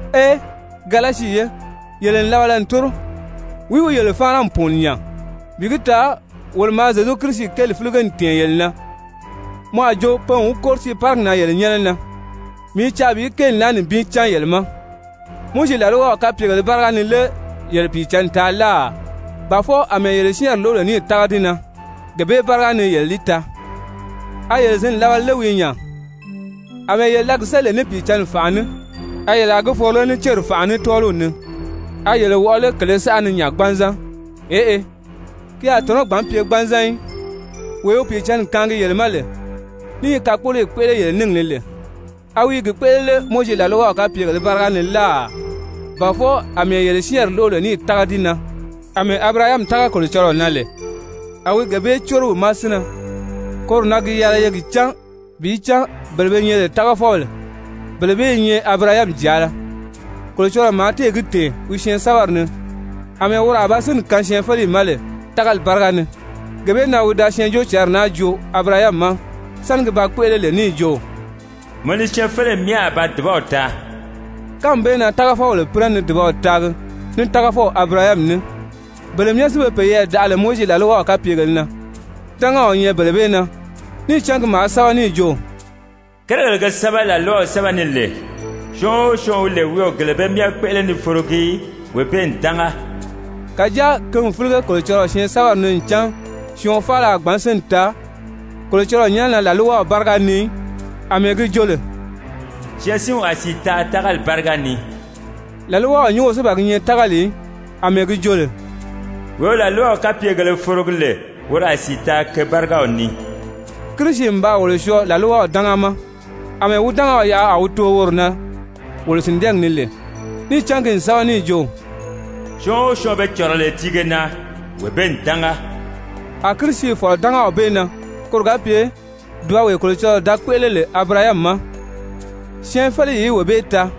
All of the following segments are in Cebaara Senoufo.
Ee, Galasi ye, yele n labala n tóro! Wìí wi yele fáana n pùuni nya? Bi gi taa wolo maa Zyezu Kirisi kéeli fílige n tɛ̀ɛn yele na, mɔ a jo pe n wi kóri tiiparigi na yele nyɛ́nɛ na. Mii i caa bi kéeli naa nibin cán yele ma, Mowizi làlwaw kapyegèlē báriga ni lé yele Pìicǎnni taa láà, ba fwɔɔ àmɛɛ yele syɛ́ɛnri lóʔo lè níì tága di na gee bee báriga ni yele li taa? A yele zǐn labala lé wii nya? Amɛɛ yele da gi séli lè ní Pìicǎnni fànʔa ní, a yele a gi foro lé ní céri fànʔa ní tɔ́ɔliw ni? A yele wɔʔɔ lé kèlē saʔa ni nya gbanzan? Eʔe, ki a tɔ̀nɔ́ gbǎn pye gbanzan í. Wee wi Pìicǎnni kaangi yele ma lè ní i kakpoloyi kpéʔele yele níngi ni lè, a wi i gi kpéʔele lé Mowizi làlwaw kapyegèlē báriga ni láà, ba fwɔɔ àmɛɛ yele syɛ́ɛnri lóʔo lè níì tága di na? Amɛɛ Abirahami tága Kolocɔlɔɔ na lè, a wi gee bee córo wi ma sínnɛ. Koro na gi yɛlɛ ye gi cán bi cán bele be nyɛ lè tágafɔbèle, bele bee i nyɛ Abirahami jàala. Kolocɔlɔɔ maa téè gi tɛ̀ɛn wi Syɛɛnsɛ́bɛri ni àmɛɛ woro a ba sínni kaan syɛɛnfeleyi ma lè tágali báriga ni, gee bee na wi da Syɛɛnjóocǎnri naa joo Abirahami ma sáni gi ba kpéʔele lè níì jo: «Mɔ ni syɛɛnfeleyi myɛ a ba dùbaw taa.» Kánmi bee na tágafɔbèle pínɛ ni dùbaw taagi ní tágafɔw Abirahami ní. Bele myɛ si be peyɛɛ daʔa lè Mowizi làlwaw kapyegèlē na, dángaw i nyɛ bele bee na, níì cán ki maa sɛ́bɛ níì jo: «Kérigèle ge sɛ́bɛ làlwaw sɛ́bɛ ni lè, syɔɔn o syɔɔn wi lè wi o gele bee myɛ kpéʔele ni forogi í, wee bee n dánga.» Kàjáa ki n fílige Kolocɔlɔɔ Syɛɛnsɛbɛri ni ncan syɔɔn faala a gbǎn sínni taa Kolocɔlɔɔ nyɛ́nɛ na làlwaw báriga ni í, àmɛɛ gi jo lè: «Syɛɛnsinw a sìi taa tágali báriga ni.» Làlwaw nyúngo si ban gi nyɛ tágali í, àmɛɛ gi jo lè: «Wee wi làlwaw kapyegèlē forogi lè woro a sìi taa ke bárigaw ni.» Kirisi n baa wolo syɔɔ làlwaw dánga ma, àmɛɛ wi dángaw yaʔa a wi too woro na wolo sìndɛɛgi ni lè, níì cán ki n sɛ́bɛ níì jo: «Syɔɔn o syɔɔn be cɔ̀rɔ lè tiige na, wee bee n dánga.» A Kirisi fɔ̀lɔ dángaw bee na koro ga pye dùbawee Kolocɔlɔɔ da kpéʔele lè Abirahami ma, syɛɛnfeleyi í wee bee taa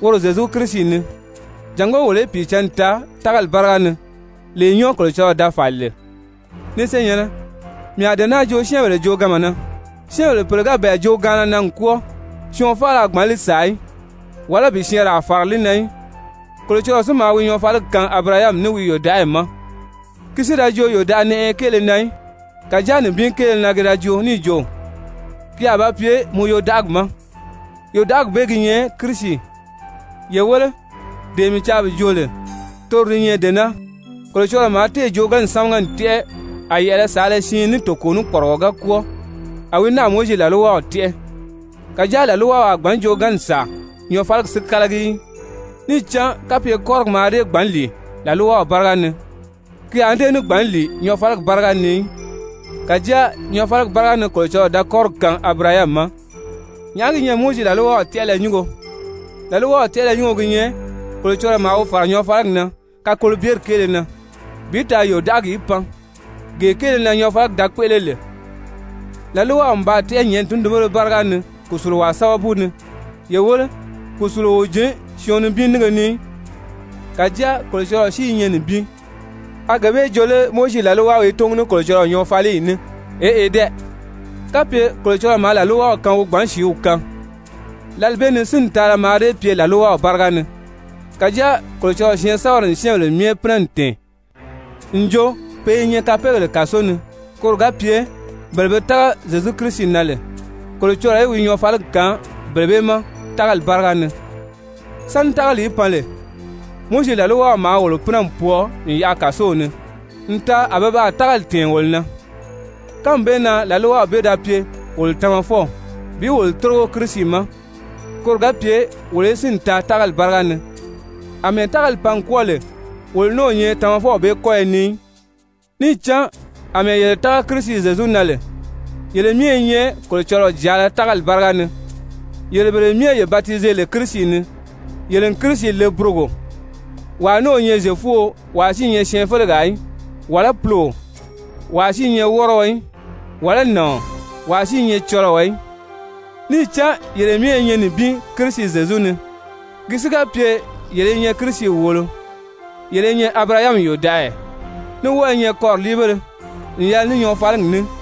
woro Zyezu Kirisi ni, jàngó wolo í Pìicǎnni taa tágali báriga ni, lee nyɔ́ɔ Kolocɔlɔɔ da fàli lè. Ni senyɛ̀nnɛ, mii a dee naa joo syɛ́ɛnbèle jooganma na, syɛ́ɛnbèle pèle ga bɛ̀ɛ joogaanna na n kwɔ́ɔ, syɔɔn faala a gbǎn li sàa í, wàlá bi syɛɛnraa fàra li na í. Kolocɔlɔɔ si maa wi nyɔɔfaliyi kaan Abirahami ní wi yòdaʔagi ma. Ki si da jo yòdaʔanɛʔɛyɛ kéele na í, kàjáa nibin kéele na ki da joo níì jo: «Ki a ba pye mɔ yodaʔagi ma,» yòdaʔagi bee gi nyɛ Kirisi. Ye wéle, dee mii caa bi joo lè, toro di nyɛ dee naa: Kolocɔlɔɔ maa téè joogaanni sámaga n tɛ́ʔɛ, a yɛ̀ʔɛlɛ saala siin ní toko ní kpɔrigɔ ga kwɔ́ɔ, a wi náà Mowizi làlwaw tɛ́ʔɛ, kàjáa làlwaw a gbǎn joogaanni sàa nyɔɔfaligi si kálagi í. Níì cán kapye kɔ́rigi mǎà dée gbǎn lìi làlwaw báriga ni, ki a ní dée gbǎn lìi nyɔɔfaligi báriga ni í, kàjáa nyɔɔfaligi báriga ni Kolocɔlɔɔ da kɔ́rigi kaan Abirahami ma. Nyàʔá gi nyɛ Mowizi làlwaw tɛ́ʔɛlɛ nyúngo? Làlwaw tɛ́ʔɛlɛ nyúngo gi nyɛ Kolocɔlɔɔ maa wi fàra nyɔɔfaligi na kakolobyeri kéele na, bi taa yòdaʔagi í pan, gee kéele na nyɔɔfaligi da kpéʔele lè. Làlwaw n baa tɛ́ʔɛ nyɛ̀ʔɛni tundunbéle báriga ni kùsuluwaa sábabu ni. Ye wéle, kùsuluo o jǐn syɔɔn nibin nínge ni í, kàjáa Kolocɔlɔɔ si i nyɛ nibin. A gee bee joo lé Mowizi làlwaw i túngu ní Kolocɔlɔɔ nyɔɔfaliyi ní? Eʔe dɛ! Kapye Kolocɔlɔɔ maa làlwaw kaan wi gbǎn sìíw kaan, lǎli bee ni sínni taala mǎà dée pye làlwaw báriga ni. Kàjáa Kolocɔlɔɔ syɛɛnsɛbɛri n syɛ́ɛnbèle myɛ pínɛ n tɛ̀ɛn n jo pe i nyɛ kapeegèle kàso ni, koro ga pye bele be tága Zyezu Kirisi na lè Kolocɔlɔɔ í wi nyɔɔfaligi kaan bele bee ma tágali báriga ni. Sáni tágali í pan lè, Mowizi làlwaw maa wolo pínɛ n pwɔɔ n yaʔa kàsow ni n taa a pe baa tágali tɛ̀ɛn wolo na. Kánmi bee na làlwaw bee da pye wolo tamafɔw bi wolo tórigo Kirisi ma koro ga pye wolo í sínni taa tágali báriga ni. Amɛɛ tágali pan n kwɔ́ɔ lè, wolo ní o nyɛ tamafɔw bee kɔ́yɔ ni í. Níì cán àmɛɛ yele tága Kirisi Zyezu na lè, yele myɛ i nyɛ Kolocɔlɔɔ jàala tágali báriga ni. Yele bele myɛ ye batize lè Kirisi ni, yele n Kirisi le burogo. Wàa ní o nyɛ Zyefuo, wàa si i nyɛ syɛɛnfelegaa í, wàlá puloo, wàa si i nyɛ wɔ́rɔɔ í, wàlá nàɔn, wàa si i nyɛ cɔlɔɔ í, níì cán yele myɛ i nyɛ nibin Kirisi Zyezu ni. Ki si ga pye yele i nyɛ Kirisi wòolo, yele i nyɛ Abirahami yòdaʔaya, ní wɔ́ɔ i nyɛ kɔriliibéle n yɛlɛ ní nyɔɔfaligi ní.